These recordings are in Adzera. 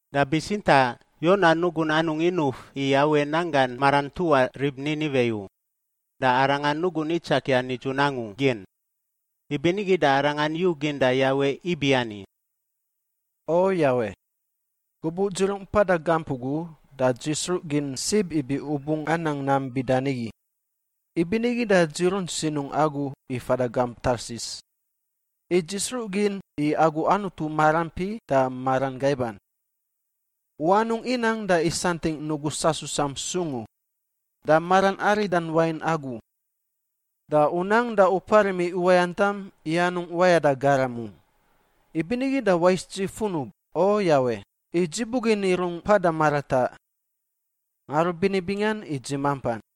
Da bitsintaꞌ Yona nugun anungꞌ inuf i Yawe nanggan maran ntuꞌa rib Niniwe u, da arangan nugun itsakia nidzun angu gin. Ibinigi da arangan yugin da Yawe ibiani, “O Yawe! Gubuꞌ dzi rungꞌ mpada gamp ugu da dzi sruꞌ gin sib ibi U bungꞌ anang nam bida nigi. Ibinigi da dzi runt sinungꞌ Agu i fada gamp Tarsis. I dzi sruꞌ gin i Agu Anutu maraampi da maran gaiban. U anungꞌ inang da isantingꞌ nugu sasusam sung u, da maran aridan wain Agu. Da U nang da U parim i uwayantam i anungꞌ wayada garam u. Ibinigi da wais dzi funub, O Yawe, i dzi bugin i rungꞌ mpada marataꞌ. Ngarubini bingan i dzi mampan.”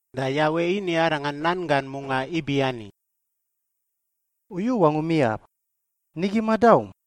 Da Yawe ini arangan nan gan mungaꞌ ibiani, “U yu wangum iyaꞌ? Nigi madaum?”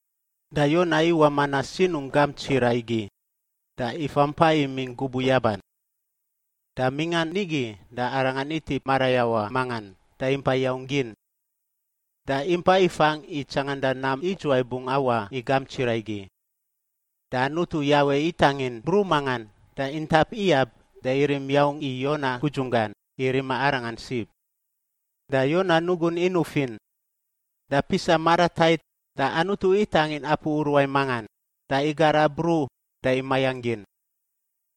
Da Yona iwaꞌ manaꞌ sinungꞌ gamp tsiraꞌ igi da ifa mpa imingꞌ gubuꞌ yaban. Da mingꞌan nigi da arangan itip marayawaꞌ mangan da impa yaung gin. Da impa ifangꞌ i tsanganda nam idzuwai bungꞌ awaꞌ i gamp tsiraꞌ igi. Da Anutu Yawe itangin bruꞌ mangan da intap iyab da irim yaung i Yona gudzunggan i rima arangan sib. Da Yona nugun inufin. Da pisa maratait da Anutu itangin apu uruai mangan da igara bruꞌ da imayangꞌ gin.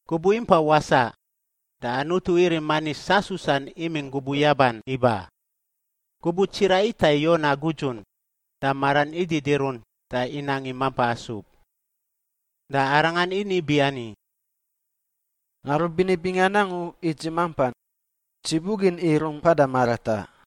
Gubuꞌ impa wasaꞌ da Anutu irim manis sasusan imingꞌ gubuꞌ yaban iba. Gubuꞌ tsiraꞌ itai Yona gudzun, da maran ididirunt da inang i mampa asub. Da arangan ini biani, “Ngarubini bingan angu i dzi mampan. Dzi bugin i rungꞌ mpada marataꞌ!”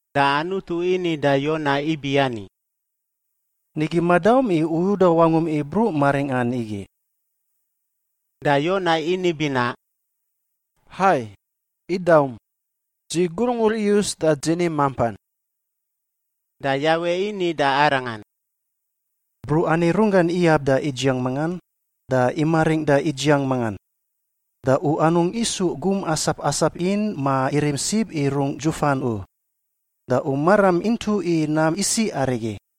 Da Anutu ini da Yona ibiani, “Nigi madaum i u uda wangum i bruꞌ maringꞌan igi?” Da Yona ini binaꞌ, “Hai, idaum! Dzi gurungur iyus da dzi ni mampan!” Da Yawe ini da arangan, “Bruꞌ ani runggan iyab da idziang mangan, da imaringꞌ da idziang mangan. Da u anungꞌ isu gum asap asap in ma irim sib i rungꞌ dzufan u. Da u maram intuꞌ i nam isiꞌ arigi.